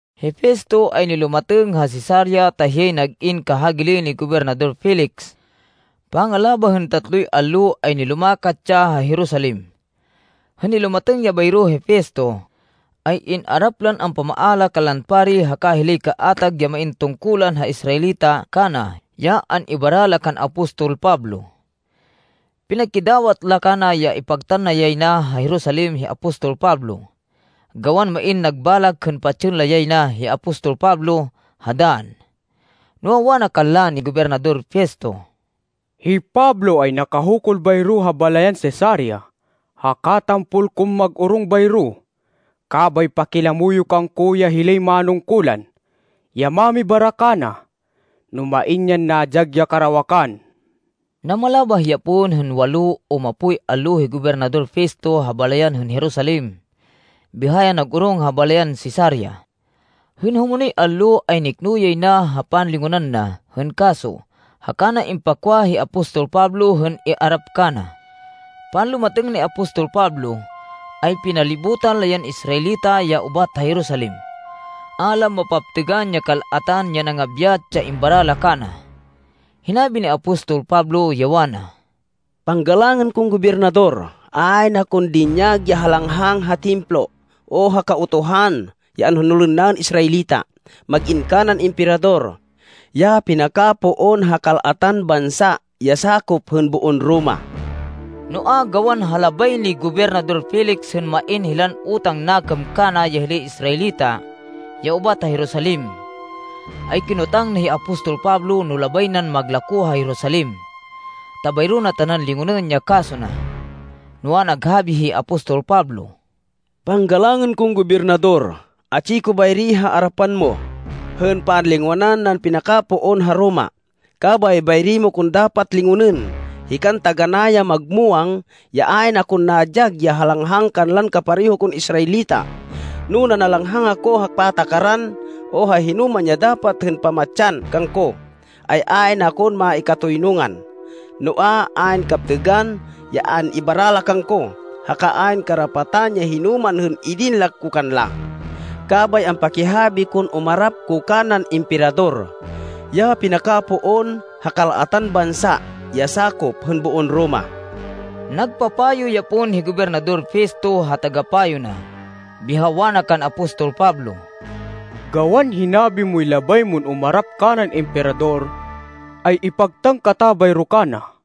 Hi Festo ay nilumatêng ha Cesarea ta hiyay nag-in kahagili ni Gobernador Felix. Pangalabah hên tatloy allo, ay nilumakat ya ha Jerusalem. Hên nilumatêng ya bayro hi Festo, ay in-arap lan ampamaala kanlan pari haka hilay kaatag ya main tungkulan ha Israelita kana ya an-ibara la kan apostol Pablo. Pinakidawat la kana ya ipagtan na yay na ha Jerusalem hi apostol Pablo, gawan main nag balak hên patsên la yay na hi apostol Pablo ha dann. Noa, wana kanla ni Gobernador Festo, “Hi Pablo ay nakahukul bayro ha balayan Cesarea, haka tampol kon mag-orong bayro. Kabay pakilamo yo kangko ya hilay manungkulan, ya mamibara kana, no main yan nadyag ya karawakan.” Namalabah ya pon hên walo o mapoy allo hi Gobernador Festo ha balayan hên Jerusalem biha ya nag-orong ha balayan Cesarea. Hên humonoy allo, ay nikno yay na ha panlingonan na hên kaso haka na impakwa hi apostol Pablo hên iarap kana. Panlumatêng ni apostol Pablo, ay pinalibutan la yan Israelita ya ubat ha Jerusalem. A la mapaptêgan ya kal-atan ya nangabyat ya imbara la kana. Hinabi ni apostol Pablo, ya wana, “Panggalangên kon Gobernador, ayn akon dinyag ya halanghang ha Templo, o ha Kautuhan ya anhonolên naên Israelita, mag-in kanan Emperador, ya pinakapoon ha kal-atan bansa ya sakop hên boon Roma.” Noa, gawan ha labay ni Gobernador Felix hên main hilan utang nakêm kana ya hilay Israelita ya ubat ha Jerusalem, ay kinotang na hi apostol Pablo no labay nan maglakó ha Jerusalem ta bayro na tanan lingonên ya kaso na. Noa, naghabi hi apostol Pablo, “Panggalangên kon Gobernador, atsi ko bayri ha arapan mo, hên panlingonan nan pinakapoon ha Roma. Kabay bayri mo kon dapat lingonên. Hikan taganá ya magmuwang, ya ayn akon nadyag ya halanghang kanlan kapareho kon Israelita. No nanalanghang ako ha patakaran, o ha hinoman ya dapat hên pamatsan kangko, ay ayn akon maikatoynungan. Noa, ayn kaptêgan ya an-ibara la kangko, haka ayn karapatan ya hinoman hên idin la ko kanla. Kabay ampakihabi kon umarap ko kanan Emperador, ya pinakapoon ha kal-atan bansa ya sakop hên boon Roma.” Nagpapayo ya pon hi Gobernador Festo ha tagapayo na, biha wana kan apostol Pablo, “Gawan hinabi moy labay mon umarap kanan Emperador, ay ipagtan kata bayro kana.”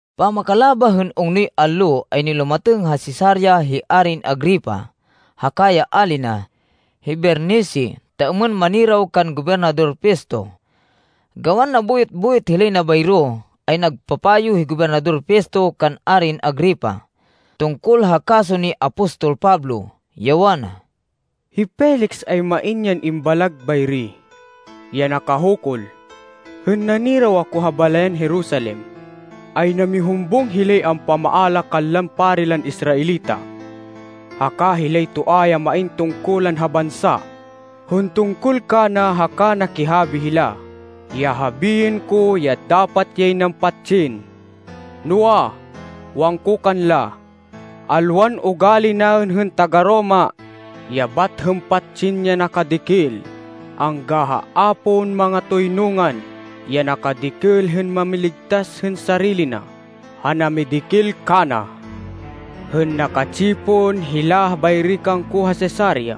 Pamakalabah hên ungnoy allo, ay nilumatêng ha Cesarea hi Arin Agripa haka ya ali na, hi Bernice, ta êmên maniraw kan Gobernador Festo. Gawan nabuyot-buyot hilay na bayro, ay nagpapayo hi Gobernador Festo kan Arin Agripa, tungkol ha kaso ni apostol Pablo, ya wana, “Hi Felix ay main yan imbalag bayri, ya nakahukul. Hên naniraw ako ha balayan Jerusalem, ay namihumbung hilay ampamaala kanlan pari lan Israelita, haka hilay toa ya main tungkulan ha bansa, hên tungkol kana haka nakihabi hila ya habiên ko ya dapat yay nan patsên. Noa, wangko kanla, ‘Alwan ugali naên hên taga-Roma, ya bat hên patsên ya nakadikil, angga ha a pon mangatoynungan, ya nakadikil hên mamiligtas hên sarili na ha namidikil kana.’ Hên naka-tsipon hila bayri kangko ha Cesarea,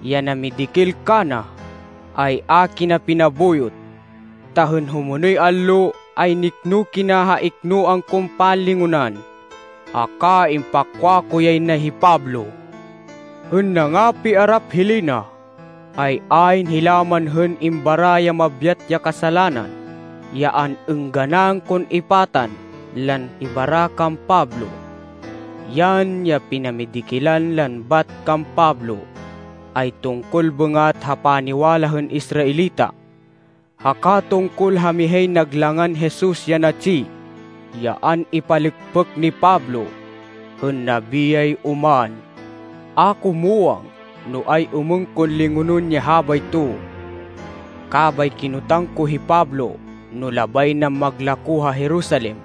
ya namidikil kana, ay a kina pinabuyot, ta hên humonoy allo ay nikno kina ha iknoan kon panlingonan haka impakwa ko yay na hi Pablo. “Hên nangapiarap hilay na, ay ayn hila man hên imbara ya mabyat ya kasalanan ya an-êngganan kon ipatan lan ibara kan Pablo. Yan, ya pinamidikilan lan bat kan Pablo ay tungkol bêngat ha paniwala hên Israelita, haka tungkol ha mihay nag langan Jesus ya natsi, ya an-ipalêkpêk ni Pablo, hên nabiyay oman. A ko muwang no ay-êmên kon lingonên ya habayto, kabay kinotang ko hi Pablo no labay nan maglakó ha Jerusalem,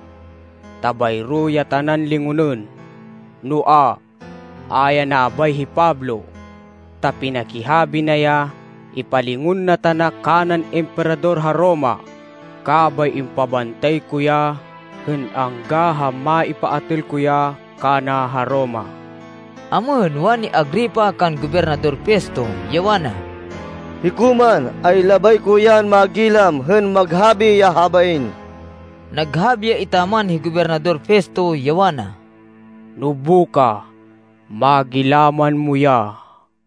ta bayro ya tanan lingonên. Noa, a ya nabay hi Pablo, ta pinakihabi na ya ipalingon na tana kanan Emperador ha Roma, kabay impabantay ko ya hên angga ha maipaatêl ko ya kana ha Roma.” Amêhên, wani Agripa kan Gobernador Festo, ya wana, “Hiko man, ay labay ko yan magilaman hên maghabi ya habain.” Naghabi ya etaman hi Gobernador Festo, ya wana, “Nobukah magilaman mo ya.”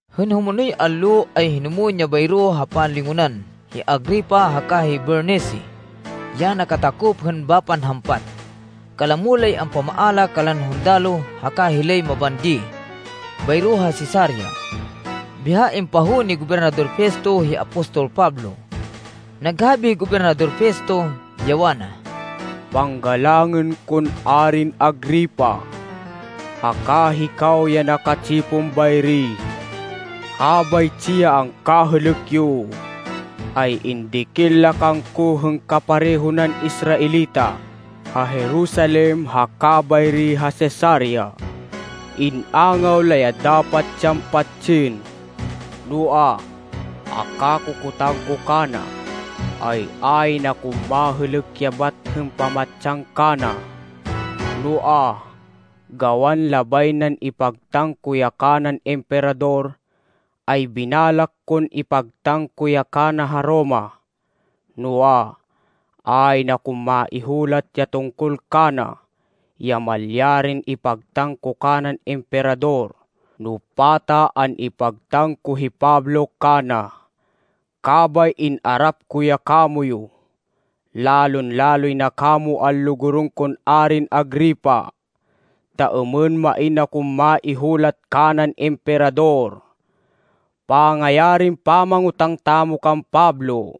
Hên humonoy allo, ay hinumwên bayro ha panlingonan, hi Agripa haka hi Bernice, ya nakatakop hên bapan hampat. Kalamo lay ampamaala kanlan hundaloh haka hilay mabandi bayro ha Cesarea. Biha impahowên ni Gobernador Festo hi apostol Pablo. Naghabi hi Gobernador Festo, ya wana, “Panggalangên kon Arin Agripa, haka hikaw ya naka-tsipon bayri. Habaytsi ya angkahêlêk yo, ay indikil la kangko hên kapareho nan Israelita ha Jerusalem haka bayri ha Cesarea. In-angaw la ya dapat yan patsên. Noa, ha kakokotang ko kana, ay ayn akon mahêlêk ya bat hên pamatsan kana. Noa, gawan labay nan ipagtan ko ya kanan Emperador, ay binalak kon ipagtan ko ya kana ha Roma. Noa, ayn akon maihulat ya tungkol kana, ya malyarin ipagtan ko kanan Emperador no pata an-ipagtan ko hi Pablo kana. Kabay in-arap ko ya kamoyu, lalon-laloy na kamo anlugurên kon Arin Agripa, ta êmên main kon maihulat kanan Emperador pangayarin pamangotang tamo kan Pablo.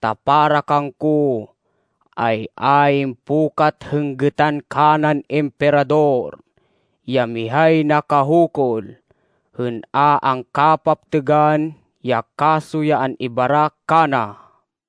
Ta para kangko, ay ayn pukat hên gêtan kanan Emperador, ya mihay nakahukul, hên a angkapaptêgan ya kaso ya an-ibara kana.”